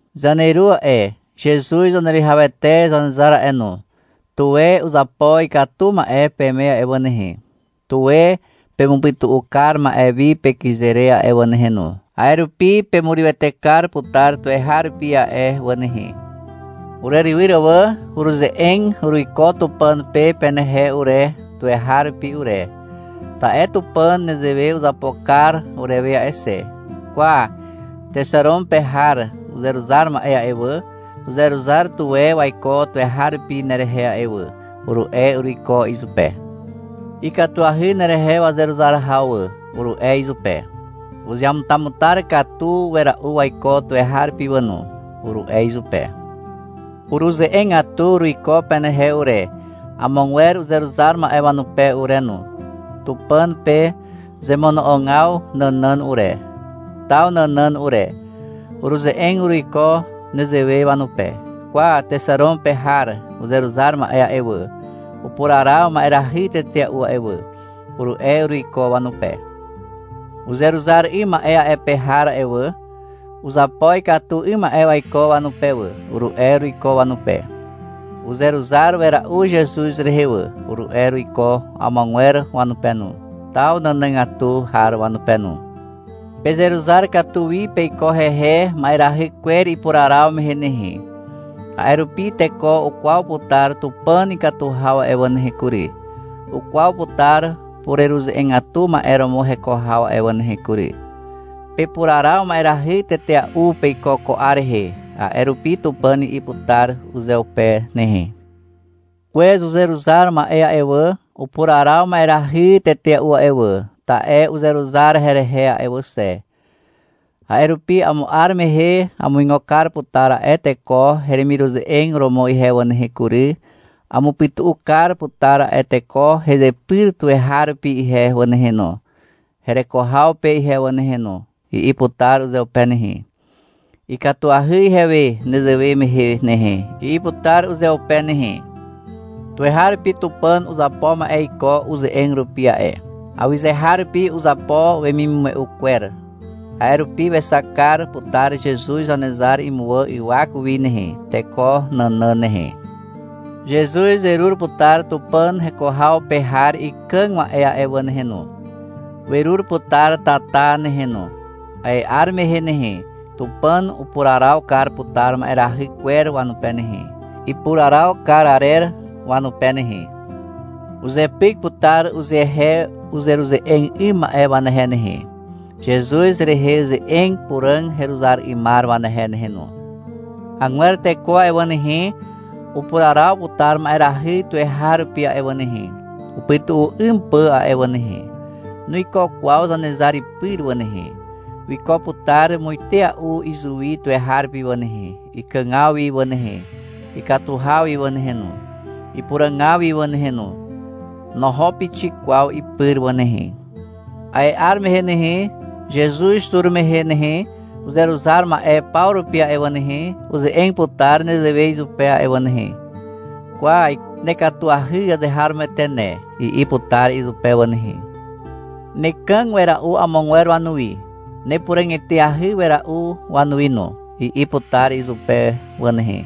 Zaneru a'e, Zezuz Zaneruwihawete Zanezar a'e no, tuwe uzapo ikatu ma'e peme a'e wà nehe, tuwe pemupytu'u kar ma'e wi pekyze re a'e wà nehe no, a'e rupi pemurywete kar putar tuweharupi a'e wà nehe. Urerywyr wà. Uruze'eg uruiko Tupàn pe penehe ure, tuweharupi ure. Ta'e Tupàn nezewe uzapo kar urewe a'e xe. — Kwa, Texaron pe har uzeruzar ma'e a'e wà, uzeruzar tuwe waiko tuweharupi nerehe a'e wà, uru'e uruiko izupe. — Ikatuahy nerehe wazeruzar haw wà, uru'e izupe. — Uzeamutamutar katu wera'u waiko tuweharupi wà no, uru'e izupe. Uruze'egatu uruiko penehe ure, amogwer uzeruzar ma'e wanupe ure no, Tupàn pe zemono'ogaw nànàn ure, taw nànàn ure. Uruze'eg uruiko nezewe wanupe. — Kwa, Texaron pe har uzeruzar ma'e a'e wà, upuraraw ma'erahy tetea'u a'e wà, uru'e uruiko wanupe. — Uzeruzar 'ym ma'e a'e pe har a'e wà, uzapo ikatu 'ym ma'e waiko wanupe wà, uru'e uruiko wanupe. — Uzeruzar wera'u Zezuz rehe wà, uru'e uruiko amogwer wanupe no, taw nànàgatu har wanupe no. Pezeruzar katu wi peiko hehe, ma'erahy kwer ipuraraw mehe nehe. A'e rupi teko ukwaw putar Tupàn ikatu haw a'e wà nehe kury, ukwaw putar pureruze'egatu ma'e romo heko haw a'e wà nehe kury. Pepuraraw ma'erahy tetea'u peiko ko 'ar rehe, a'e rupi Tupàn i'i putar uzeupe nehe. — Kwez uzeruzar ma'e a'e wà, upuraraw ma'erahy tetea'u a'e wà, ta'e uzeruzar herehe a'e wà xe. A'e rupi amo 'ar mehe amuigo kar putar a'e teko heremiruze'eg romo ihe wà nehe kury, amupyta kar putar a'e teko hezepyr tuweharupi ihe wà nehe no, hereko haw pe ihe wà nehe no, i'i putar uzeupe nehe. — Ikatuahy ihewe nezewe mehe nehe, i'i putar uzeupe nehe. Tuweharupi Tupàn uzapo ma'e iko uze'eg rupi a'e. Awyzeharupi uzapo wemimume'u kwer. A'e rupi wexak kar putar Zezuz Zanezar imuwà ywak wi nehe, teko nànàn nehe. Zezuz werur putar Tupàn heko haw pe har ikàg ma'e a'e wà nehe no. Werur putar tata nehe no. A'e 'ar mehe nehe, Tupàn upuraraw kar putar ma'erahy kwer wanupe nehe, ipuraraw kar arer wanupe nehe. Uzepyk putar uzehe uzeruze'eg 'ym ma'e wanehe nehe, Zezuz rehe ze'eg puràg heruzar 'ymar wanehe nehe no. Agwer teko a'e wà nehe, upuraraw putar ma'erahy tuweharupi a'e wà nehe, upytu'u 'ym pà a'e wà nehe. Nuiko kwaw Zanezar ipyr wà nehe. Wiko putar muitea'u izuwi tuweharupi wà nehe, ikàgaw wi wà nehe, ikatu haw wi wà nehe no, ipuràgaw wi wà nehe no. Noho pixik kwaw ipyr wà nehe. A'e 'ar mehe nehe, Zezuz tur mehe nehe, uzeruzar ma'e paw rupi a'e wà nehe, uze'eg putar nezewe izupe a'e wà nehe. — Kwa, nekatuahy azeharomoete ne, i'i putar izupe wà nehe. — Nekàg wera'u amogwer wanuwi, nepuràg eteahy wera'u wanuwi no, i'i putar izupe wà nehe.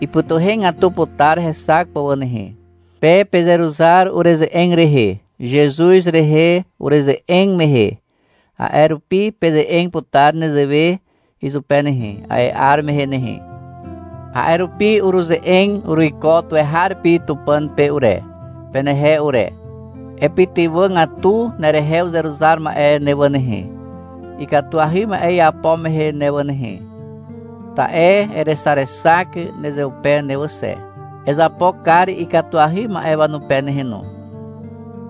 Ipytuhegatu putar hexak pà wà nehe. Pe pezeruzar ureze'eg rehe, Zezuz rehe ureze'eg mehe. A'e rupi peze'eg putar nezewe izupe nehe, a'e 'ar mehe nehe. A'e rupi uruze'eg uruiko tuweharupi Tupàn pe ure, penehe ure. — Epytywàgatu nerehe uzeruzar ma'e ne wà nehe, ikatuahy ma'e iapo mehe ne wà nehe. Ta'e erexarexak nezeupe ne wà xe. Ezapo kar ikatuahy ma'e wanupe nehe no.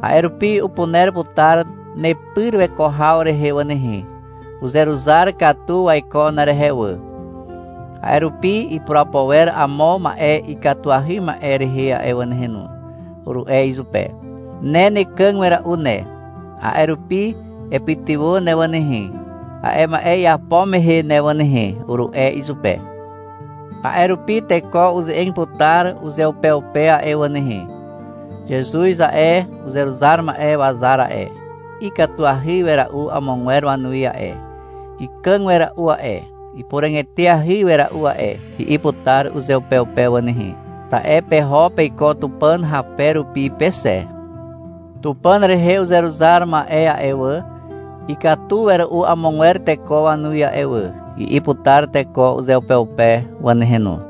A'e rupi upuner putar nepyr weko haw rehe wà nehe. Uzeruzar katu waiko nerehe wà. A'e rupi ipurapo wer amo ma'e ikatuahy ma'e rehe a'e wà nehe no, uru'e izupe. — Ne nekàg wera'u ne, a'e rupi epytywà ne wà nehe, a'e ma'e iapo mehe ne wà nehe, uru'e izupe. A'e rupi teko uze'eg putar uzeupeupe a'e wà nehe. — Zezuz a'e, uzeruzar ma'e wazar a'e, ikatuahy wera'u amogwer wanuwi a'e, ikàg wera'u a'e, ipuràg eteahy wera'u a'e, i'i putar uzeupeupe wà nehe. Ta'e peho peiko Tupàn hape rupi pe xe. — Tupàn rehe uzeruzar ma'e a'e wà, ikatu wera'u amogwer teko wanuwi a'e wà, i'i putar teko uzeupeupe wà nehe no,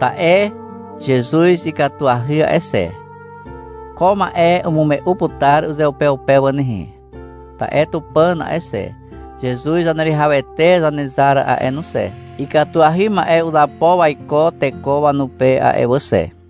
ta'e Zezuz ikatuahy a'e xe. Ko ma'e umume'u putar uzeupeupe wà nehe, ta'e Tupàn a'e xe, Zezuz Zaneruwihawete Zanezar a'e no xe, ikatuahy ma'e uzapo waiko teko wanupe a'e wà xe.